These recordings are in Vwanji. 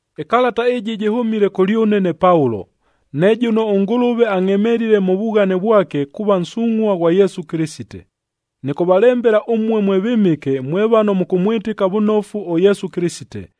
Ɨkalata ɨjɨ jɨhʉmile kʉlyʉne ne Paulo, ne jʉno ʉNgʉlʉve angʼhemelile mʉ vughane vwake kuuva nsungʼhua ghwa Yesu Kɨlɨsite. Nɨkʉvalembela ʉmue mwe vɨmɨke, mwe vano mʉkʉmwɨtɨka vʉnofu ʉYesu Kɨlɨsite,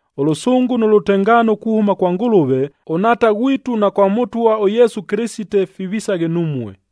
Ʉlʉsʉngʉ nʉ lʉtengaano kuhʉma kwa Ngʉlʉve ʉNhaata ghwitu na kwa Mʉtwa ʉYesu Kɨlɨsite, fivisaghe numue.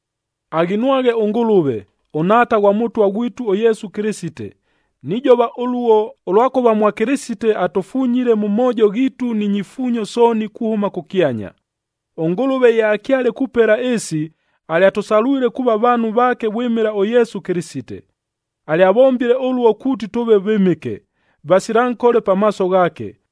Aghinwaghe ʉNgʉlʉve, ʉNhaata ghwa Mʉtwa ghwitu ʉYesu Kɨlɨsite! Nijova ʉluo, ʉlwakʉva mwa Kɨlɨsite atʉfunyile mʉ moojo ghiitu ni nyifuunyo sooni kuhʉma kʉkyanya. ɄNgʉlʉve ye akyale kupela ɨɨsi, alyatʉsalwile kuuva vaanhu vaake vwɨmɨla ʉYesu Kɨlɨsite. Alyavombile ʉluo kuuti tʉʉve vɨmɨke, vasila nkole pamaaso ghaake.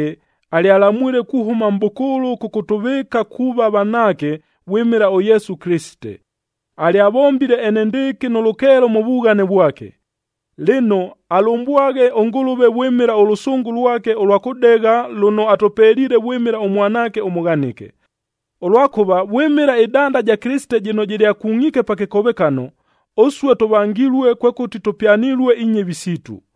alyalamwile kuhʉma mʼbʉkʉʉlʉ kʉkʉtʉvɨɨka kuuva vanaake vwɨmɨla ʉYesu Kɨlɨsite. Alyavombile enendɨɨkɨ nʉ lʉkeelo mʉ vughane vwake. Lɨno, alʉmbwaghe ʉNgʉlʉve vwɨmɨla ʉlʉsʉngʉ lwake ʉlwa kʉdegha lʉno atʉpeliile vwɨmɨla ʉMwanaake ʉmʉghanɨke. Ʉlwakʉva vwɨmɨla ɨdanda ɨja Kɨlɨsite jɨno jɨlyakungʼiike pa kɨkovekano, ʉsue tʉvangilue, kwekʉti tʉpyanilue inyɨvi siitu.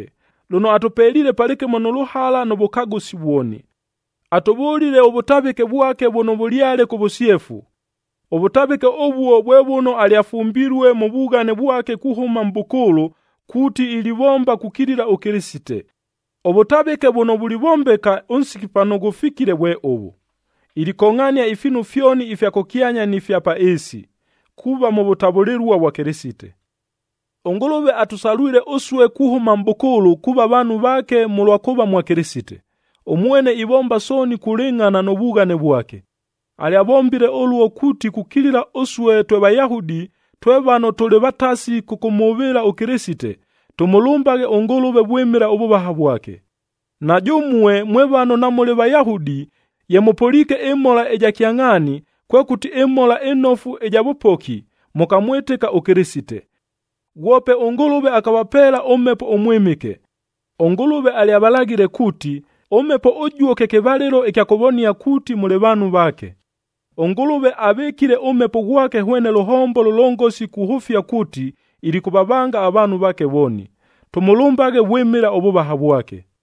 lʉno atʉpeliile palɨkɨmo nʉ lʉhala nʉ vʉkagʉsi vwoni. Atʉvʉlile ʉvʉtavɨke vwake vʉno vʉlyale kʉ vʉsyefu. Ʉvʉtavɨke ʉvuo vwe vʉno alyafumbilue mʉ vughane vwake kuhʉma mʼbʉkʉʉlʉ, kuuti ilivomba kukilila ʉKɨlɨsite. Ʉvʉtavɨke vʉno vulivombeka ʉnsiki pano ghʉfikile vwe ʉvʉ: Ilikongʼhania ifiinu fyoni ifya kʉkyanya ni fya pa ɨɨsi, kuuva mʉ vʉtavʉlɨlua vwa Kɨlɨsite. ɄNgʉlʉve atʉsalwile ʉsue kuhʉma mʼbʉkʉʉlʉ kuuva vaanhu vaake mʉlwa kuuva mwa Kɨlɨsite. Ʉmwene ivomba sooni kulɨngʼhana nʉ vughane vwake. Alyavombile ʉluo kuuti kukilila ʉsue twe Vayahudi, twe vano tʉlɨ vatasi kʉkʉmhʉvɨɨla ʉKɨlɨsite, tʉmʉlʉmbaghe ʉNgʉlʉve vwɨmɨla ʉvʉvaha vwake! Na jʉmue mwe vano namʉlɨ Vayahudi, ye mʉpʉliike ɨmhola ɨja kyangʼhaani, kwekʉti ɨMhola ɨNofu ɨja vʉpoki, mʉkamwɨtɨka ʉKɨlɨsite. Ghwope ʉNgʉlʉve akavapeela ʉMhepo ʉMwɨmɨke. ɄNgʉlʉve alyavalaghile kuuti, ʉMhepo ʉjuo kye kɨvalɨlo ɨkya kʉvonia kuuti mʉlɨ vaanhu vaake. ɄNgʉlʉve avɨkiile ʉMhepo ghwake hwene lʉhombo lʉlongosi kuhʉfia kuuti, ilikʉvavanga avaanhu vaake lwoni. Tʉmʉlʉmbaghe vwɨmɨla ʉvʉvaha vwake.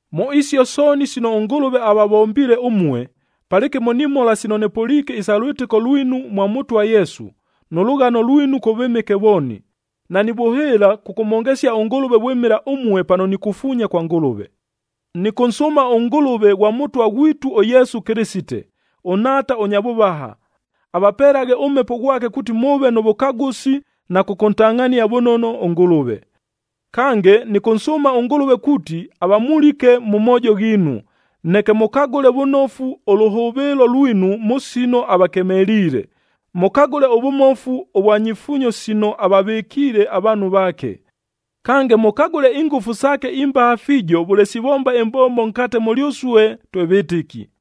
Mʉ isio sooni sino ʉNgʉlʉve avavombiile ʉmue, palɨkɨmo ni mhola sino nɨpʉliike isa lwɨtɨko lwinu mwa Mʉtwa ʉYesu, nʉ lʉghano lwinu kʉ vɨmɨke vooni, nanivʉhɨɨla kʉkʉmhongesia ʉNgʉlʉve vwɨmɨla ʉmue pano nikufuunya kwa Ngʉlʉve. Nɨkʉnsʉʉma ʉNgʉlʉve ghwa Mʉtwa ghwitu ʉYesu Kɨlɨsite, ʉNhaata ʉnya vʉvaha, avapelaghe ʉMhepo ghwake kuuti mʉʉve nʉ vʉkagʉsi na kʉkʉntangʼhania vʉnono ʉNgʉlʉve. Kange, nɨkʉnsʉʉma ʉNgʉlʉve kuuti avamulike mʉ moojo ghiinu, neke mʉkagʉle vʉnofu ʉlʉhʉvɨɨlo lwinu mʉ sino avakemeliile, mʉkagʉle ʉvʉmofu ʉvwa nyifuunyo sino avavɨkiile avaanhu vaake. Kange, mʉkagʉle ingʉfu saake imbaha fiijo vʉle sivomba ɨmbombo nkate mʉlyʉsue twe vɨtɨki.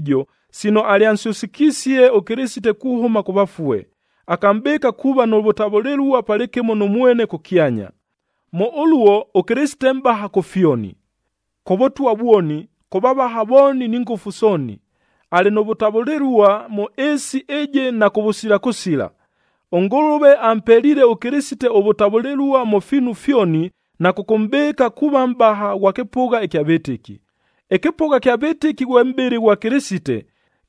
sino alyansyʉsɨkisie ʉKɨlɨsite kuhʉma kʉ vafue, akamʼbɨɨka kuuva nʉ vʉtavʉlɨlua palɨkɨmo nʉ mwene kʉkyanya. Mʉ ʉluo ʉKɨlɨsite mʼbaha kʉ fyoni: kʉ vʉtwa vwoni, kʉ vavaha vooni ni ngʉfu sooni. Alɨ nʉ vʉtavʉlɨlua mʉ ɨɨsi ɨjɨ na kʉvʉsila kʉsila. ɄNgʉlʉve ampeliile ʉKɨlɨsite ʉvʉtavʉlɨlua mʉ fiinu fyoni na kʉkʉmʼbɨɨka kuuva Mʼbaha ghwa kɨpʉgha ɨkya vɨtɨki. Ɨkɨpʉgha ɨkya vɨtɨki ghwe mʼbɨlɨ ghwa Kɨlɨsite,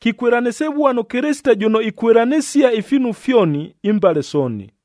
kikwɨlanɨsɨvua nʉ Kɨlɨsite jʉno ikwɨlanɨsia ifiinu fyoni, imbale sooni.